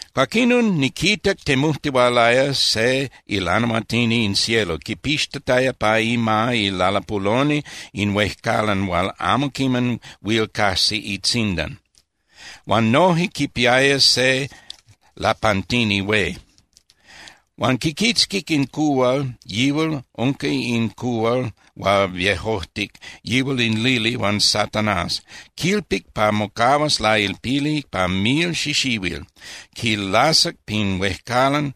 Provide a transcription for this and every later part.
Cuaquinon, niquitac temujtihualaya se ilanahuatini in cielo, quipixtataya pa ima ilalapuloni in huejcalan hual amo quiman huil cajsi itzindan, huan noje quipiaya se lapantini hué. Huan quiquitzquic in cuhual, yihual unca in cuhual hual viejojtic, yihual in lili huan Satanás. Quilpic pa mocahuas lailpili pa mil xixihuil. Quilasac pin huejcalan,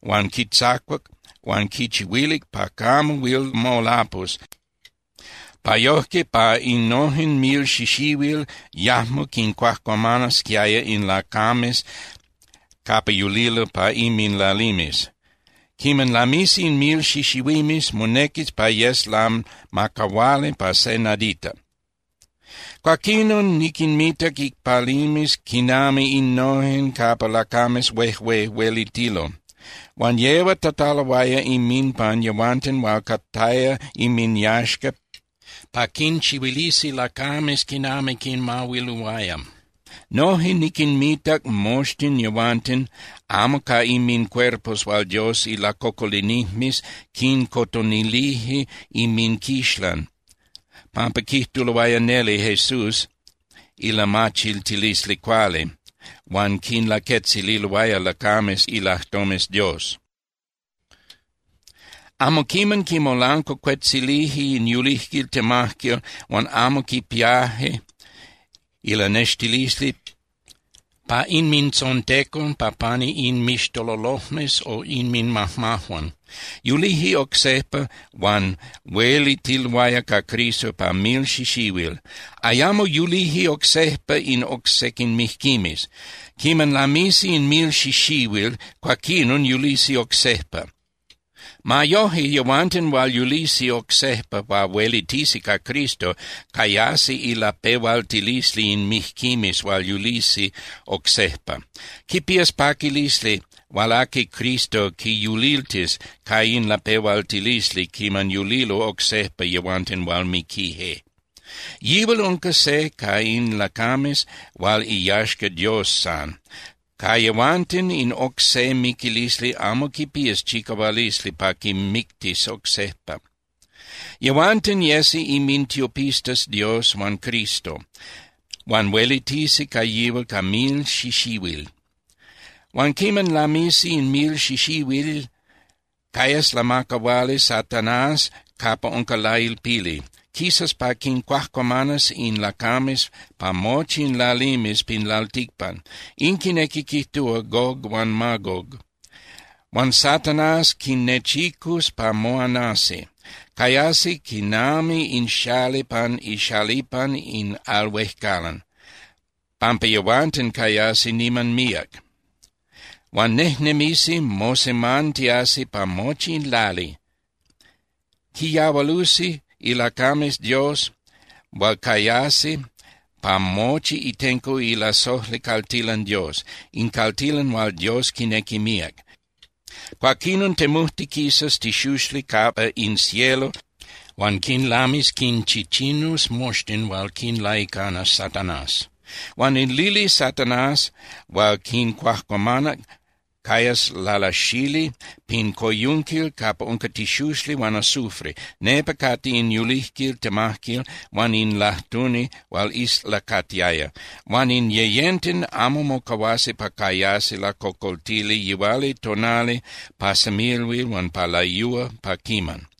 huan quitzacuac huan quichihuilic pa camo huil molapus, pa yojque pa innojen mil xixihuil yajmo quincuajcuamanasquiaya in lacames capa yulilo pa inminlalimes. Quiman lamisi in mil xixihuimes, monequis pa yes lamacahuali pa se nadita. Cuaquinon niquinmitac icpalimes quinami innojen capa lacames huejué huelitilo, huan yehuatataloaya inminpan yehuanten hual cataya inminyaxca pa quinchihuilisi lacames quinami quinmahuiluaya. Noje niquinmitac moxtin yehuanten amo ca inmincuerpos hual Dios ilacocolinijmes quincotonilije inminquixlan pampa quijtuloaya neli Jesús ilamachiltilisli cuali huan quinlaquetzililoaya lacames ilajtomes Dios. Amo quiman quimolancuacuetzilije in yulijquil temajquil huan amo quipiaje ilanextilisli pa inmintzontecon pa pani inmixtololojmes o inminmajmajuan. Yulije oc sejpa huan huelitiloaya ca Cristo pa mil xixihuil. Ayamo yulije oc sejpa in oc sequin mijquimes. Quiman lamisi in mil xixihuil, cuaquinon yulisi oc sejpa. Ma yoje, yehuanten hual yulisi oc sejpa pa huelitisi ca Cristo cayasi ilapehualtilisli in mijquimes hual yulisi oc sejpa. Quipías paquilisli hual aqui Cristo quiyuliltis ca in lapehualtilisli quiman yulilo oc sejpa yehuanten hual miquije. Yihual unca se ca in lacames hual iyaxca Dios san. Ca yehuanten in oc se miquilisli amo quipías chicahualisli pa quinmictis oc sejpa. Yehuanten yesi inmintiopistas Dios huan Cristo, huan huelitisi ca yihual ca mil xixihuil. Huan quiman lamisi in mil xixihuil, cayas lamacahuali Satanás capa unca lailpili. Quisas pa quincuajcuamanas in lacames pa mochi in lalimes pin lalticpan, in quinequi quijtúa Gog huan Magog. Huan Satanás quinnechicus pa moanasi. Cayasi quinami in xali pan ixalipan in al huejcalan, pampa yehuanten cayasi niman míac. Huan nejnemisi mosemantiasi pa mochi in lali. Quiyahualusi ilacames Dios hual cayasi pa mochi itenco ilasojli caltilan Dios, in caltilan hual Dios quinequi míac. Cuaquinon temujtiquisas tixuxli capa in cielo huan quinlamis quinchichinus moxtin hual quinlaicanas Satanás. Huan in lili Satanás hual quincuajcuamanac cayas lalasali pin coyunquil capa unca tixuxli huan azufre, nepa cate in yulijquil temajquil huan in lajtuni hual islacatiaya. Huan in yeyenten amo mocahuasi pa cayasi lacocoltili yihualitonali pa semilhuil huan pa layúa pa quiman.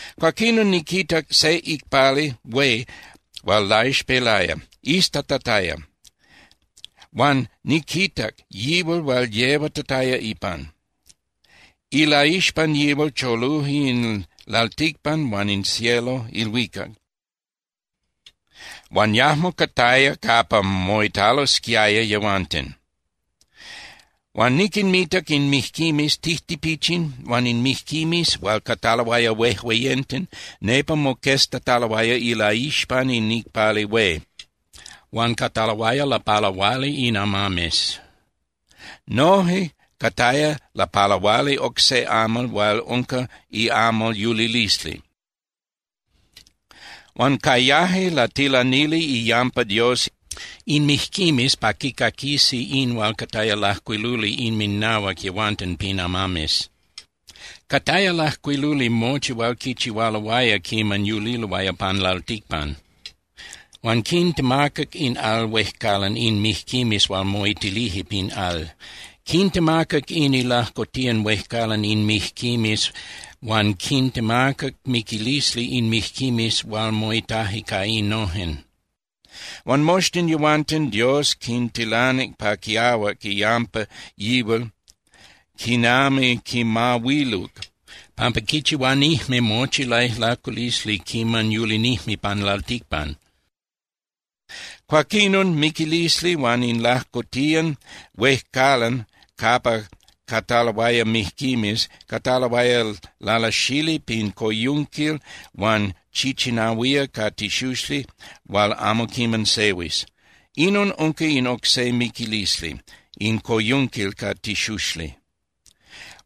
Cuaquinon niquitac se icpali hué hual laixpelaya, iztatataya, huan niquitac yihual hual yehuatataya ipan. Ilaixpan yihual choluje in lalticpan huan in cielo (ilhuicac), huan yajmo cataya capa moitalosquiaya yehuanten. Huan niquinmitac in mijquimes tijtipichin huan in mijquimes hual cataloaya huejueyenten nepa moqueztataloaya ilaixpan in icpali hué. Huan cataloaya lapalahuali in amames. Noje cataya lapalahuali oc se amal hual unca iamal yulilisli. Huan cayaje latilanili iyampa Dios in mijquimes pa quicaquisi in hual cataya lajcuiluli inminahuac yehuanten pin amames. Cataya lajcuiluli mochi hual quichihualoaya quiman yuliloaya pan lalticpan. Huan quitemacac in al huejcalan in mijquimes hual moitilije pin al. Quitemacac in ilajcotiyan huejcalan in mijquimes huan quitemacac miquilisli in mijquimes hual moitaje ca innojen. Huan moxtin yehuanten Dios quintilanic pa quiahuac iyampa yihual quinami quinmahuiluc pampa quichihuanijme mochi laijlaculisli quiman yulinijme pan lalticpan. Cuaquinon miquilisli huan in lajcotiyan huejcalan capa cataloaya mijquimes cataloaya lalasali pin coyunquil hual chichinahuía ca tixuxli hual amo quiman sehuis. Inon unca in oc se miquilisli, in coyunquil ca tixuxli.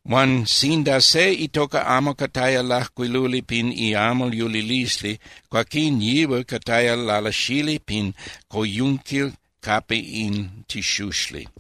Huan sinda se itoca amo cataya lajcuiluli pin iamal yulilisli, cuaquín yihual cataya lalasali pin coyunquil capa in tixuxli.